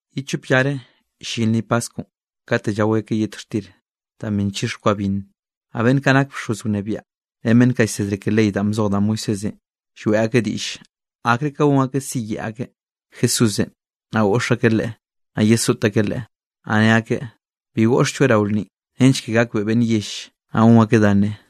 Ye chop llare llin lnni paskwnꞌ, katenꞌ llao akeꞌ yet xtir da bi nchix kwa binn; naꞌ beꞌnn kaꞌ nak bxoz wnebiaꞌ ren beꞌnn kaꞌ llsedre ke ley danꞌ bzoj da Moisésenꞌ, lloeꞌ akeꞌ diꞌll akre ka gon akeꞌ siyeꞌe akeꞌ Jesúsenꞌ, naꞌ goꞌx akeꞌ Leꞌe, naꞌ yesoꞌt akeꞌ Leꞌe. Naꞌ ne akeꞌ: —Bi goꞌxlloeꞌ rao lnninꞌ nench ke gakbeꞌe beꞌnn yell, naꞌ gon akeꞌ dá nne.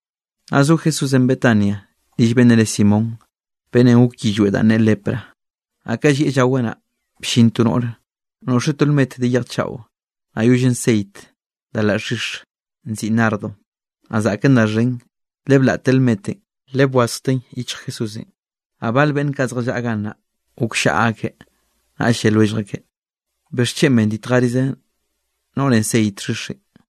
Naꞌ zo Jesúsenꞌ Betania rill beꞌnnenꞌ re Simón, beꞌnnenꞌ goke yillweꞌ danꞌ ne lepra. Naꞌ ka llieꞌ llaweꞌ naꞌ, bllin to noꞌre noꞌxeꞌ to lmet de yej chaꞌo, naꞌ yollen ceit da laꞌ xhix nziꞌi nardo, naꞌ zaꞌken da xhen; le blaꞌteꞌ lmetenꞌ le bwazjteꞌn yichj Jesúsenꞌ. Naꞌ bale beꞌnn kaꞌ zjallaꞌa gannaꞌ gokllaꞌa akeꞌ, naꞌll lle lwellj akeꞌ: —¿Bixchen benditjerize noꞌrenꞌ ceit xhixenꞌ?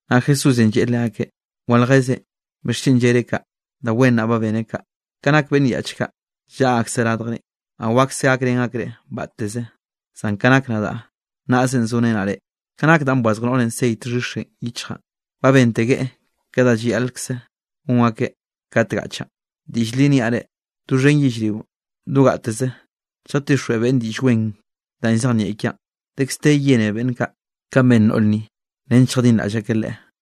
Naꞌ Jesúsenꞌ lleꞌe leakeꞌ: —Waljezen. ¿Bixchen llereꞌ kaꞌ? Da wen naꞌ beneꞌ kaꞌ. Ka nak beꞌnn yaꞌch kaꞌ llaꞌa akseꞌ radjrenꞌ, naꞌ wakse gakrén akreꞌ batteze, zan ka nak nadaꞌ, nnaꞌzenꞌ zorenaꞌ reꞌ. Ka nak danꞌ bwazj noꞌrenꞌ ceit xhixenꞌ yichjaꞌn, ba bentegueꞌ ke da llayaꞌlkze gon akeꞌ kat gaꞌchaꞌn. Diꞌll li niaꞌ reꞌ, doxhen yellrio do gateze lljatixjweꞌ beꞌnn Diꞌll Wen danꞌ llzejnieꞌ kiaꞌn, dekz de yene beꞌnn kaꞌ, kanꞌ ben noꞌr ni, nench lljadinraꞌll akeꞌ leꞌe.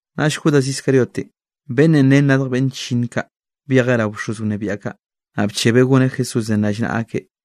Naꞌll Judas Iscariotenꞌ beꞌnnenꞌ ren radj beꞌnn chllinn kaꞌ, byejeꞌ rao bxoz wnebiaꞌ kaꞌ, naꞌ bchebeꞌ goneꞌ Jesúsenꞌ rallnaꞌa akeꞌ.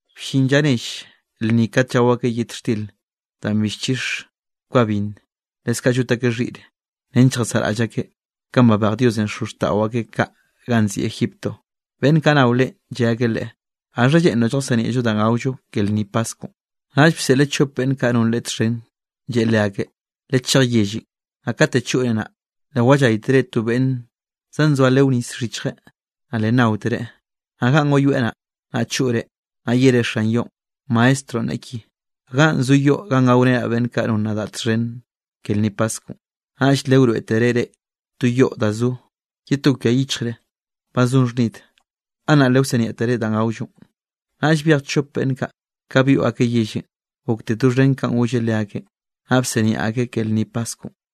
Bllin lla nell lnni kat llao akeꞌ yet xtir danꞌ bi nchix kwa binn, leskaꞌ llot akeꞌ xhiꞌre nench lljasaꞌraꞌll akeꞌ kanꞌ babej Diosenꞌ xozxtaꞌo akeꞌ kaꞌ ganꞌ nziꞌi Egipto. Beꞌnn kaꞌ nao Leꞌen lle akeꞌ Leꞌe: —¿Gaxha lleꞌnroꞌ lljasiniaꞌllo da gaollo ke lnni paskwnꞌ? Naꞌll bseꞌleꞌ chop beꞌnn kaꞌ non Leꞌe txhen, lleꞌe leakeꞌ: —Lechej yellenꞌ, naꞌ kat choꞌre naꞌ, le walláytere to beꞌnn zanzoa leo nis xhichjeꞌ, naꞌ le nnaotereꞌ. Naꞌ ganꞌ wayoeꞌ naꞌ, naꞌ choꞌre, naꞌ yere xan yoꞌn: “Maestronꞌ neꞌe ki: ¿Ganꞌ zo yoꞌ ganꞌ gaorenaꞌ beꞌnn kaꞌ non nadaꞌ txhen ke lnni paskwnꞌ?” Naꞌll le wroeꞌtereꞌ reꞌ to yoꞌ da zo ye to kwia yichje ba zon xhnid. Gannaꞌ le wsiniaꞌtere danꞌ gaollonꞌ. Naꞌll byej chop beꞌnn kaꞌ, ka byoꞌ akeꞌ yellenꞌ gokte doxhen kanꞌ golleꞌ leakeꞌn, naꞌ bsiniaꞌ akeꞌ ke lnni paskwnꞌ.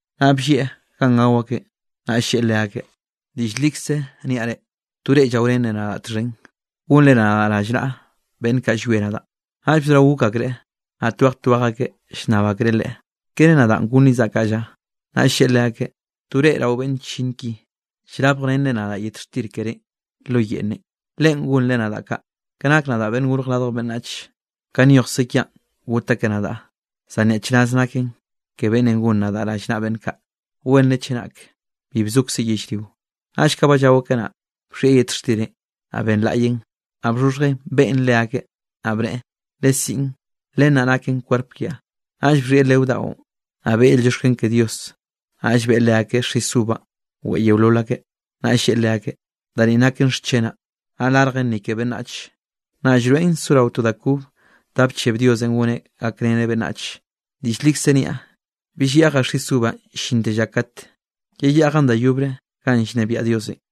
Naꞌ bllieꞌ ganꞌ gao akeꞌn, naꞌ lleꞌe leakeꞌ: —Diꞌll likze niaꞌ reꞌ, to reꞌ llaorenre nadaꞌ txhen, gonre nadaꞌ rallnaꞌa beꞌnn kaꞌ llwie nadaꞌ. Naꞌll bzorao gok akreꞌ, naꞌ twej twej akeꞌ llnnab akreꞌ Leꞌe: —¿Kere nadaꞌn gonrizaꞌ kaꞌ lla? Naꞌll lleꞌe leakeꞌ: —To reꞌ rao beꞌnn chllinn ki, llrabjrenre nadaꞌ yet xtir kerénꞌ lo yeꞌnnenꞌ, leꞌen gonreꞌ nadaꞌ kaꞌ. Ka nak nadaꞌ, Beꞌnn Gorj Radj Beꞌnnach, ka nyojkze kiaꞌn got akeꞌ nadaꞌ, zan ¡nyaꞌchraz naken ke beꞌnnenꞌ gon nadaꞌ rallnaꞌa beꞌnn kaꞌ! Wenre chenak bi bzokzeꞌ yellrionꞌ. Naꞌll ka ba llao akeꞌ naꞌ, bxhieꞌ yet xtirenꞌ, naꞌ benlaꞌyeꞌn, naꞌ bxhoxhjeꞌn beꞌen leakeꞌ, naꞌ bneꞌe: —Lesiꞌn, len naꞌ naken kwerp kiaꞌ. Naꞌll bxhieꞌ leo daꞌon, naꞌ beꞌe yel llioxken ke Dios, naꞌll beꞌe leakeꞌ xis uvanꞌ weꞌe yeolol akeꞌ. Naꞌ lleꞌe leakeꞌ: —Da ni naken xchenaꞌ, naꞌ larjen ni ke beꞌnnach, naꞌ llroeꞌn sorao to da kobe danꞌ bcheb Diosenꞌ goneꞌ gakreneꞌ beꞌnnach. Diꞌll likze niaꞌ, bill yeꞌjaꞌ xis uvanꞌ llinte lla kat yeyeꞌjaꞌn da yobre ganꞌ llnebiaꞌ Diosenꞌ.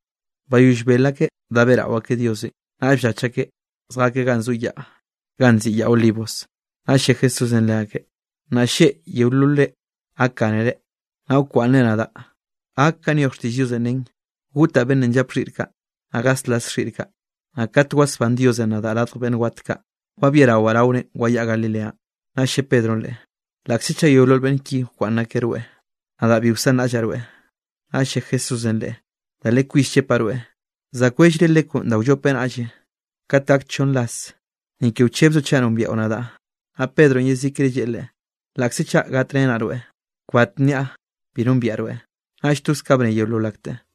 Bayoll bel akeꞌ da beꞌrao akeꞌ Diosenꞌ, naꞌll bllach akeꞌ zjakeꞌ ganꞌ zo yaꞌ ganꞌ nziꞌi Yaꞌ Olivos. Naꞌll lle Jesúsenꞌ leakeꞌ: —Nnaꞌ lleꞌ yeololre gakgánere, naꞌ wkwaꞌnnre nadaꞌ, gak kanꞌ nyoj xtiꞌll Diosenꞌ nen: “Gotaꞌ beꞌnnenꞌ llap xhiꞌr kaꞌ, naꞌ gaslas xhiꞌr kaꞌ.” Naꞌ kat wasbán Diosenꞌ nadaꞌ radj beꞌnn wat kaꞌ, wabiarawaꞌ raore wayaꞌa Galileanꞌ. Naꞌll lle Pedronꞌ Leꞌe: —Laꞌkze chaꞌ yeolol beꞌnn ki wkwaꞌnn akeꞌ rweꞌ, nadaꞌ bi wsanraꞌllaꞌ rweꞌ. Naꞌll lle Jesúsenꞌ leꞌe: —Da li kwis llepaꞌ rweꞌ, za kwellre lekwnꞌ da wllope nnaꞌ lleꞌ, kat gak chonn ras, ni ke wchebzoꞌ chaꞌ nombiaꞌo nadaꞌ. Naꞌ Pedronꞌ yezikre lleꞌe Leꞌe: —Laꞌkze chaꞌ gatrenaꞌ rweꞌ, kbat nniaꞌ bi nombiaꞌ rweꞌ. Naꞌll toz kaꞌ bne yeolol akteꞌ.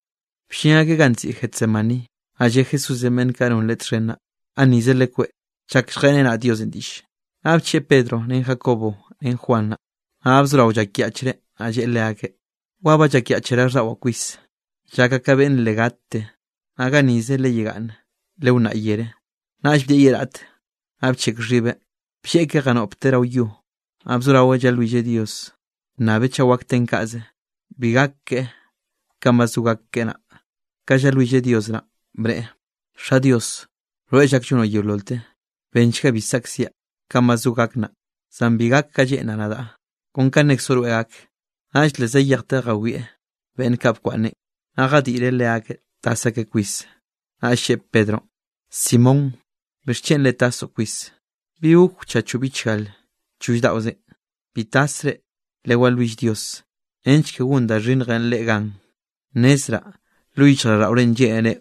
Bllin akeꞌ ganꞌ nziꞌi Getsemaní, naꞌ lle Jesúsenꞌ beꞌnn kaꞌ non Leꞌe txhen naꞌ: —Gannize lekweꞌ, chak lljeꞌrenaꞌ Diosenꞌ diꞌlle. Naꞌ bcheꞌe Pedronꞌ, ren Jacobo ren Juan naꞌ, naꞌ ba bzorao llakyaꞌchreꞌ. Naꞌ lleꞌe leakeꞌ: —Wa ba llakyaꞌch raꞌlldaꞌwaꞌn kwis, llakaꞌ ka beꞌnn le gatte, naꞌ gannize legaꞌye, lewnnaꞌ yere. Naꞌll bdieꞌ ye raꞌte, naꞌ bcheꞌk xhibeꞌ, blleꞌkeꞌ janoꞌpteꞌ rao yo, naꞌ bzoraweꞌ llalwilleꞌ Dios bnnabeꞌ chaꞌ wak ten kaꞌze, bi gak keꞌe kanꞌ ba zo gak keꞌe naꞌ. Ka llalwilleꞌ Dios naꞌn, bneꞌe: —Xa Dios, rweꞌ llak llonoꞌ yeololte, benchga bi saꞌkziaꞌ kanꞌ ba zo gak naꞌ, zan bi gak ka lleꞌnraꞌ nadaꞌ, kon ka nnekzoꞌ rweꞌ gak. Naꞌll le zayejteꞌ jawieꞌ beꞌnn kaꞌ nkwaꞌnneꞌn, naꞌ jadiꞌreꞌ leakeꞌ tas akeꞌ kwis. Naꞌll lleꞌe Pedronꞌ: —Simón, ¿bixchen le tasoꞌ kwis? ¿Bi gok wchachoꞌ bichgalenꞌ choll daꞌozenꞌ? Bi tasre, lewalwill Dios nench ke gon da xhinnjenꞌ reꞌ gan. Nnezraꞌ lo yichjraꞌlldaꞌorenꞌ lleꞌnere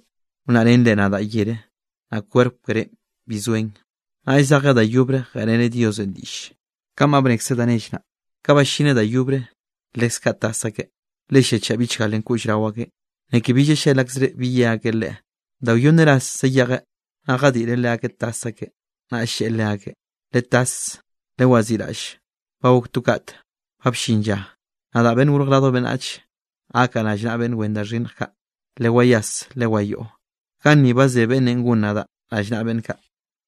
wnnaꞌrenre nadaꞌ yere, naꞌ kwerp kerénꞌ bi zoen. Naꞌll zejeꞌ da yobre, jeꞌreneꞌ Diosenꞌ diꞌlle kanꞌ ba bnekzeꞌ da nell naꞌ. Ka ballineꞌ da yobre, leskaꞌ tas akeꞌ, le lliachaꞌ bichgalenꞌ koꞌll rao akeꞌn, ni ke bi llallel akzreꞌ bi ye akeꞌ Leꞌe. Da wyonn rase zayejeꞌ, naꞌ jadiꞌreꞌ leakeꞌ tas akeꞌ, naꞌll lleꞌe leakeꞌ: —¡Letas, lewaziꞌraꞌll! Ba gok to kat, ba bllin lla, nadaꞌ, Beꞌnn Gorj Radj Beꞌnnach, gakaꞌ rallnaꞌa beꞌnn wen da xhinnj kaꞌ. ¡Lewayas, lewayoꞌo! Gannize ba ze beꞌnnenꞌ gon nadaꞌ rallnaꞌa beꞌnn kaꞌ.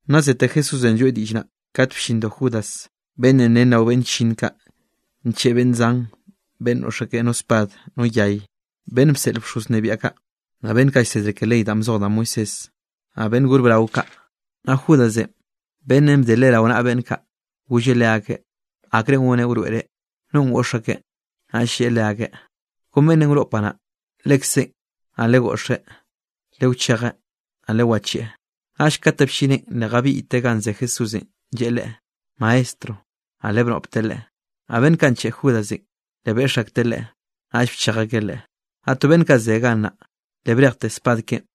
Naꞌ zete Jesúsenꞌ lloeꞌ diꞌll naꞌ, kat bllindo Judas beꞌnnenꞌ ren rao beꞌnn chllinn kaꞌ, ncheꞌe beꞌnn zan beꞌnn noꞌx no spad no yay, beꞌnn bseꞌl bxoz wnebiaꞌ kaꞌ, naꞌ beꞌnn kaꞌ llsedre ke ley danꞌ bzoj da Moisésenꞌ, naꞌ beꞌnn gor brao kaꞌ. Naꞌ Judasenꞌ beꞌnnenꞌ bde Leꞌe rao naꞌa beꞌnn kaꞌ, golleꞌ leakeꞌ akrenꞌ goneꞌ wroeꞌreꞌ nonꞌ goꞌx akeꞌ. Naꞌll lleꞌe leakeꞌ: —Kon beꞌnnenꞌ wnoꞌpaꞌ naꞌ, lekzeꞌn. Naꞌ legoꞌxeꞌ, lewchejeꞌ, naꞌ lewacheꞌe. Naꞌll kate bllineꞌn, le jabiꞌyteꞌ ganꞌ ze Jesúsenꞌ lleꞌe Leꞌe: —Maestro. Naꞌ le bnoꞌpteꞌ Leꞌe. Naꞌ beꞌnn kaꞌ ncheꞌe Judasenꞌ, le beꞌx akteꞌ Leꞌe, naꞌll bchej akeꞌ Leꞌe. Naꞌ to beꞌnn kaꞌ ze gannaꞌ, le brejteꞌ spad keꞌen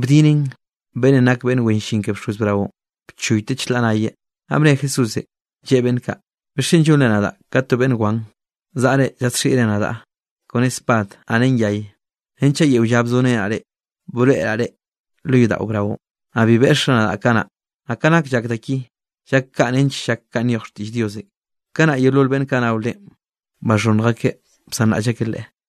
bdineꞌn beꞌnnenꞌ nak beꞌnn wen llin ke bxoz braonꞌ, bchoyteꞌ chlaꞌ nayeꞌ. Naꞌ bne Jesúsenꞌ, lleꞌe beꞌnn kaꞌ: —¿Bixchen llonre nadaꞌ ka to beꞌnn wan, zaꞌre zadxiꞌre nadaꞌ kone spad, naꞌ ren yay? Renchaꞌ yeo lla bzorenaꞌ reꞌ, broeꞌraꞌ reꞌ lo yodaꞌo braonꞌ, naꞌ bi beꞌxre nadaꞌ kanaꞌ. Naꞌ ka nak llak da ki, llak kaꞌ nench llak kanꞌ nyoj xtiꞌll Diosenꞌ. Kanaꞌ yeolol beꞌnn kaꞌ nao Leꞌen, baxhonnj akeꞌ bsanraꞌll akeꞌ Leꞌe.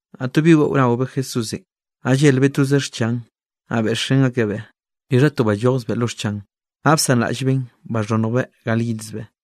Naꞌ to bi weꞌo naobeꞌ Jesúsenꞌ, naꞌ llelbeꞌ toze xchan, naꞌ beꞌxrén akebeꞌ. Bixha to ballojzbeꞌ lo xchan, naꞌ bsanraꞌllbeꞌn baxhonnjbeꞌ gal yidzbeꞌ.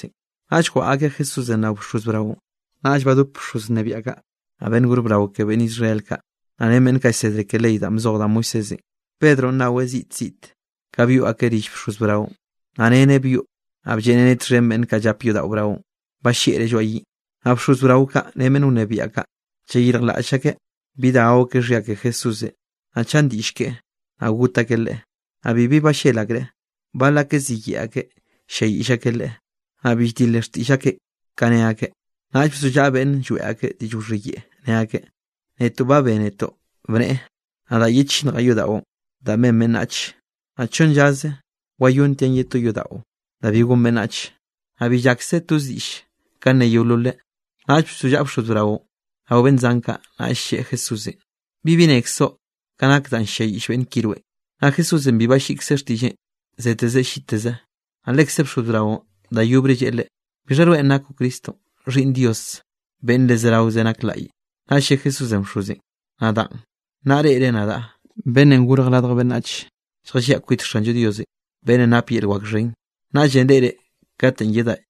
Naꞌll jwaꞌa akeꞌ Jesúsenꞌ rao bxoz braonꞌ, naꞌll badopeꞌ bxoz wnebiaꞌ kaꞌ, naꞌ beꞌnn gor brao ke beꞌnn Israel kaꞌ, naꞌ ren beꞌnn kaꞌ llsedre ke ley danꞌ bzoj da Moisésenꞌ. Pedronꞌ naweꞌ ziꞌt ziꞌte, ka byoꞌ akeꞌ rill bxoz braonꞌ, naꞌ reneꞌ byoꞌ, naꞌ blleꞌreneꞌ txhen beꞌnn kaꞌ llap yodaꞌo braonꞌ, balleꞌreꞌ lloaꞌ yiꞌn. Naꞌ bxoz brao kaꞌ ren beꞌnn wnebiaꞌ kaꞌ, llayirjlaꞌll akeꞌ bi da gao akeꞌ xhia ke Jesúsenꞌ, naꞌ chan diꞌll keꞌe, naꞌ got akeꞌ Leꞌe. Naꞌ bibi ballel akreꞌ. Bal akeꞌ ziyeꞌe akeꞌ ll-lliayiꞌll akeꞌ Leꞌe, naꞌ bill dile xtiꞌll akeꞌ ka ne akeꞌ. Naꞌll bzollaꞌa beꞌnn lloeꞌ ak diꞌll wxhiyeꞌe, ne akeꞌ: —Netoꞌ ba bénetoꞌ bneꞌe: “Nadaꞌ yechinnjaꞌ yodaꞌon danꞌ ben beꞌnnache, naꞌ chonn llaze wayontiaꞌ ye to yodaꞌo da bi gon beꞌnnach.” Naꞌ bi llakse toz diꞌlle ka ne yeololeꞌ. Naꞌll bzollaꞌa bxoz braonꞌ rao beꞌnn zan kaꞌ, naꞌll lleꞌe Jesúsenꞌ: —¿Bibi nnekzoꞌ ka nak danꞌ ll-lliayiꞌll beꞌnn ki rweꞌn? Naꞌ Jesúsenꞌ bi balliꞌkzeꞌ xtiꞌlleꞌn, zeteze lliteze, naꞌll lekze bxoz braonꞌ da yobre lleꞌe Leꞌe: —¿Bixha rweꞌn nakoꞌ Cristonꞌ, Xhiꞌnn Dios beꞌnn le zeraoze nak laꞌye? Naꞌll lle Jesúsenꞌ bxozenꞌ: —Nadaꞌn, naꞌ reꞌre nadaꞌ, Beꞌnnenꞌ Gorj Radj Beꞌnnach, lljalliaꞌ kwit Xanllo Dios beꞌnnenꞌ nap yel wak xhen, naꞌll reꞌreꞌ katenꞌ yedaꞌ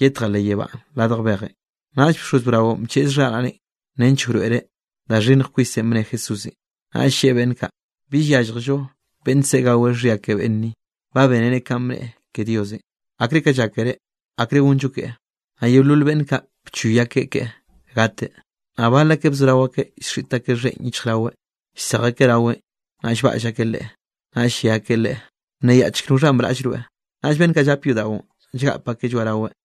yetjaꞌ leꞌ yebánꞌ radj bejenꞌ. Naꞌll bxoz braonꞌ bcheꞌz xharaꞌneꞌ nench wroeꞌreꞌ da xhinnj kwisenꞌ bne Jesúsenꞌ, naꞌll lleꞌe beꞌnn kaꞌ: —Bill yálljello beꞌnn se gaweꞌ xhia ke beꞌnn ni. Ba bénere kanꞌ bnneꞌe ke Diosenꞌ. ¿Akre ka llákere? ¿Akre gonllo keꞌe? Naꞌ yeolol beꞌnn kaꞌ bchoy akeꞌ keꞌe gateꞌ. Naꞌ bal akeꞌ bzorao akeꞌ llxiꞌt akeꞌ xheꞌn yichjraweꞌ, llsej akeꞌ raweꞌn, naꞌ llbaꞌll akeꞌ Leꞌe, naꞌll lle akeꞌ Leꞌe: —¡Bnneyaꞌchk noxhanꞌ braꞌll rweꞌ! Naꞌll beꞌnn kaꞌ llap yodaꞌon llgap akeꞌ lloaꞌraweꞌ.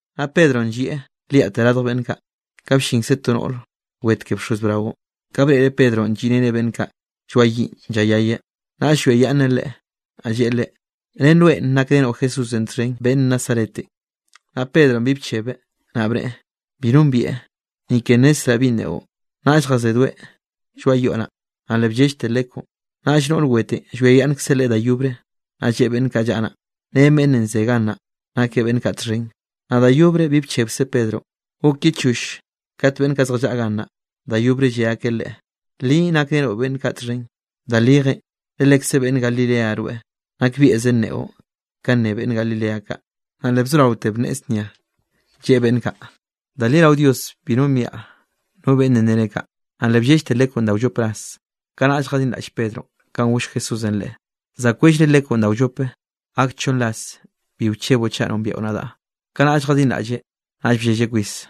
Naꞌ Pedronꞌ llieꞌ liaꞌte radj beꞌnn kaꞌ, ka bllinkze to noꞌr wet ke bxoz braonꞌ. Ka breꞌreꞌ Pedronꞌ lliꞌreneꞌ beꞌnn kaꞌ lloaꞌ yiꞌn llayayeꞌ, naꞌll llwiayaꞌnneꞌ leꞌe, naꞌ lleꞌe leꞌe: —Ren rweꞌn nakrenoꞌ Jesúsenꞌ txhen beꞌnn Nazaretenꞌ. Naꞌ Pedronꞌ bi bchebeꞌ, naꞌ bneꞌe: —Bi nombieꞌ, ni ke nnezzraꞌ binꞌ neꞌo. Naꞌll jazedoeꞌ lloaꞌ yoꞌ naꞌ, naꞌ le bllellte lekw. Naꞌll noꞌr wetenꞌ llwiayaꞌnnkzeꞌ leꞌe da yobre, naꞌ lleꞌe beꞌnn kaꞌ llaꞌa naꞌ: —Ren beꞌnnenꞌ ze gannaꞌ nakeꞌ beꞌnn kaꞌ txhen. Naꞌ da yobre bi bchebkze Pedronꞌ. Gok ye choll kat beꞌnn kaꞌ zjallaꞌa gannaꞌ da yobre lle akeꞌ leꞌe: —Li nakrenoꞌ beꞌnn kaꞌ txhen, da lijenꞌ, le lekze beꞌnn Galilea rweꞌ, nakbieꞌze nneꞌo kanꞌ nne beꞌnn Galilea kaꞌ. Naꞌ le bzoraote bnneꞌe znia, lleꞌe beꞌnn kaꞌ: —Da li rao Dios bi nombiaꞌ no beꞌnnenꞌ nere kaꞌ. Naꞌ le bllellte lekwnꞌ da wllop rase. Kanaꞌll jadinraꞌll Pedronꞌ kanꞌ goll Jesúsenꞌ leꞌe: “Za kwellre lekwnꞌ da wllope, gak chonn ras bi wcheboꞌ chaꞌ nombiaꞌo nadaꞌ.” Kanaꞌll jadinraꞌlleꞌ, naꞌll bllelleꞌ kwis.